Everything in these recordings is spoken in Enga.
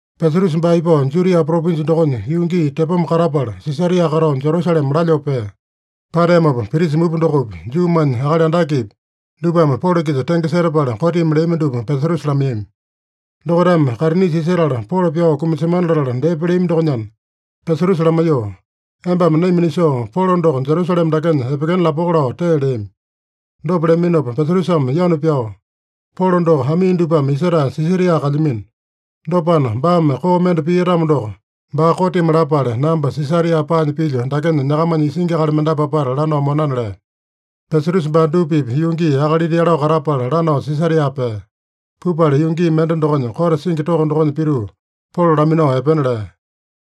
Pesatusa baa ipao Judia propinja dokonya yuu gii tepoma katapala, Sisaria katao Jerusalema lalyoo pea. Pateamopa, prisa mupa dokopi, Juumanya akali andakepi, dupame Polo-kisa tenge setapala kotimi leami dupa Pesatusa lamaiyami. Dokaitame kaitinisa isetala Polo pyao kumasemana latala depa leami dokonyana, Pesatusa lamaiyoo, “Embame naima nisoo, Polo doko Jerusalema dakenya epekena lapoko” lao tee leami. Dopa leaminopa Pesatusame yanu pyao, “Polo doko amii dupame isetae Sisaria kalyamino. Dopana, baame koo mende pia-tamo doko, baa kotimi lapale namba Sisaria paanya pilyo dakenya nyakamanya isingi akali mendapu apata lanao monana” lea. Pesatusa baa dupa-pipa yuu gii akalita yalao katapala lanao Sisaria pea. Pupala yuu gii mende dokonya, kote singi toko dokonya pituu, Polo laminao epena lea.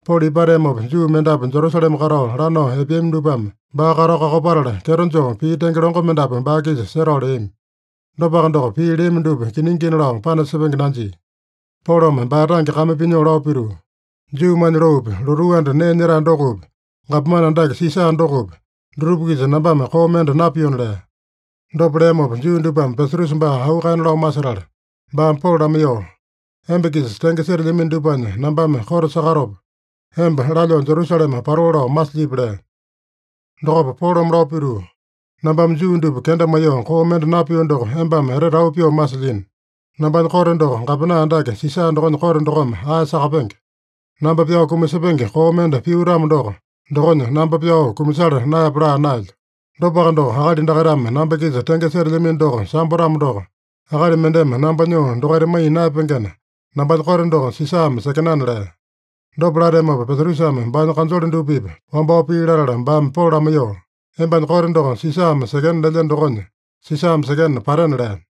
Polo ipateamopa, Juu mendapu Jerusalema katao lanao epeami dupame baa katao kakopatala, kyeto joo pii tenge longo mendapu baa-kisa setao leami. Dopaka doko, pii leami dupa kiningina lao panasepenge nanjia. Polome baa tange kame pinyoo lao pituu, “Juumanya loopi, lotuu anda nee nyetae dokopi, gapomane andake Sisa dokopi, dutupa-kisa nambame koo mende napiona” lea. Dopa leamopa, Juu dupame Pesatusa baa auu kaena lao masetala, baame Polo lamaiyoo, “Emba-kisa tenge setelyamino dupanya nambame kote sakatopa, emba lalyoo Jerusalema patoo lao masilyipi?” lea. Dokopa Polome lao pituu, “Nambame Juu dupa kenda maiyoo koo mende napio doko embame etete auu pyoo masilyino. Nambanya kote doko gapomane andake Sisa dokonya kote dokome ae sakapenge. Namba pyao kumasepenge koo mende pio-tamo doko, dokonya namba pyao kumasala naeyape laa naelyo. Dopaka doko, akali dakaitame namba-kisa tenge setelyamino doko sambo-tamo doko, akali mendeme namba nyoo dokaita maiya naeyapengena, nambanya kote doko Sisame sekenana” lea. Dopa lateamopa, Pesatusame baanya kanjole dupa-pipa wambao pii latala, baame Polo lamaiyoo, “Embanya kote doko Sisame sekena lelyeno dokonya, Sisame sekena patena” lea.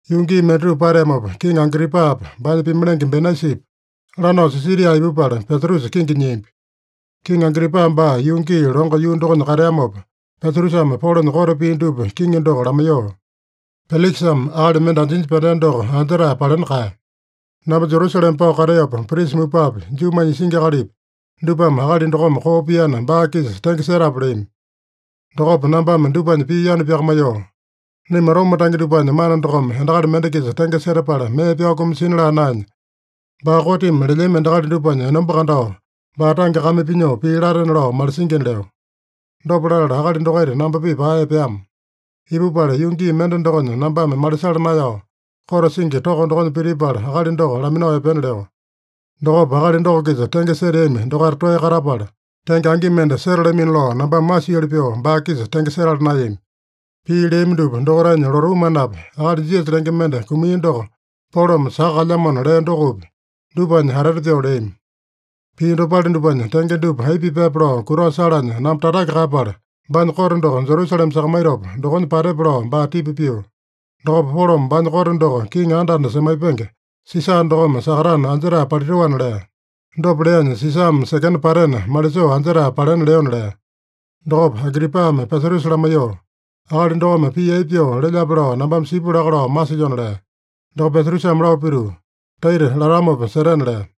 Yuu gii mendatupa pateamopa, Kiŋi Agripapa, baanya pimalenge Benaisipa, lanao Sisaria ipupala, Pesatusa kingi nyiambi. Kiŋi Agripa baa yuu gii longo yuu dokonya kateamopa, Pesatusame Polonya kote pii dupa kiŋi doko lamaiyoo, “Pelikisame akali mende anjinya pyandea doko anjetae palena kaeya. Namba Jerusalema pao kateopa, prisa mupapi, Juumanya isingi akalipi, dupame akali dokome koo piana, baa-kisa tenge setape leami. Dokopa nambame dupanya pii yanu pyakamaiyoo, ‘Naima Roma tange dupanya mana dokome endakali mende-kisa tenge setapala mee pyao kumasina laa naenya, baa kotimi lelyami endakali dupanya enomba kandao, baa tange kame pinyoo pii latena lao malisingina’ leo. Dopa latala akali dokaita namba-pipa ae epeama. Ipupala, yuu gii mende dokonya nambame malisala naeyao, kote singi toko dokonya pitipala, akali doko laminao epena leo. Dokopa akali doko-kisa tenge seteami dokaita toeya katapala, tenge angi mende setalamino lao nambame masioli pyoo baa-kisa tenge setala naeyami. Pii leami dupa, dokaitanya lotuu manapi, akali Jisasa lenge mende kumia doko Polome saka kalyamona lea dokopi, dupanya atete pyoo leami. Pii dopale dupanya tenge dupa aipa pipaepe lao kutao salanya namba tatake kaeyapala, baanya kote doko Jerusalema sakamaitopa dokonya patepe lao baa tipa pio. Dokopa Polome baanya kote doko kiŋi anda-anda semaipenge Sisa dokome sakatana anjetae palitoana lea. Dopa leanya, Sisame sekena patena, malisoo anjetae palena leona” lea. Dokopa Agripame Pesatusa lamaiyoo, “Akali dokome pii aipa pyoo lelyape lao nambame sipu laka lao masilyona” lea. Dokopa Pesatusame lao pituu, “Taita latamopa setena” lea.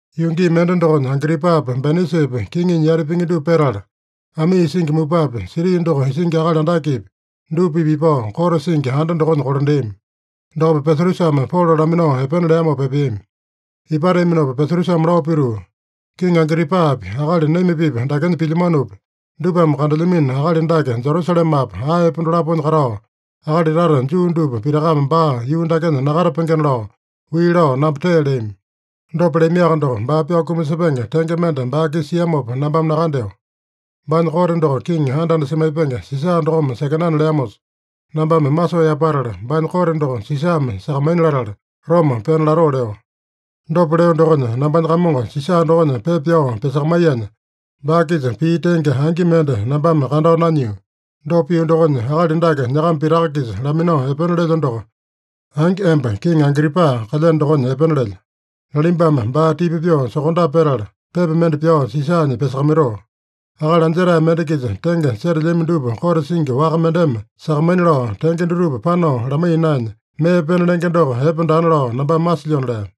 Yuu gii mende dokonya, Agripapa Benaisipa kiŋinya yati pingi dupa petala, amii isingi mupapi, siti doko isingi akali andakepi, dupa-pipa ipao, kote singi anda dokonya kolandeami. Dokopa Pesatusame Polo laminao epena leamopa epeami. Ipateaminopa Pesatusame lao pituu, “Kiŋi Agripapi, akali naima-pipa dakenya pilyamanopi, dupame kandelyamino akali dake Jerusalemapa, aepa dolaponya katao, akali tata Juu dupa pitakame baa yuu dakenya nakatapengena lao, wii lao namba tee leami. Dopa leamiaka doko, baa pyao kumasepenge tenge mende baa-kisa siamopa nambame nakandeo. Baanya kote doko kiŋi anda-anda semaipenge Sisa dokome sekenana leamosa, nambame masoo yapatala, baanya kote doko Sisame sakamaina latala, Roma pena latoo leo. Dopa leo dokonya, nambanya kamongo Sisa dokonya pepa pyao pyasakamaiyanya, baa-kisa pii tenge angi mende nambame kandao nanyio. Dopa pio dokonya, akali dake nyakama pitaka-kisa laminao epena lelyo doko, angi emba kiŋi Agripa kalyeno dokonya epena lelyo. Nalimbame baa tipa pyoo sokondape petala, pepa mende pyao Sisanya pyasakamaitoo. Akali anjetae mende-kisa tenge setelyami dupa kote singi waka mendeme sakamaina lao, tenge dutupa panao lamaiya naenya, mee pena lenge doko epe daana lao nambame masilyona” lea.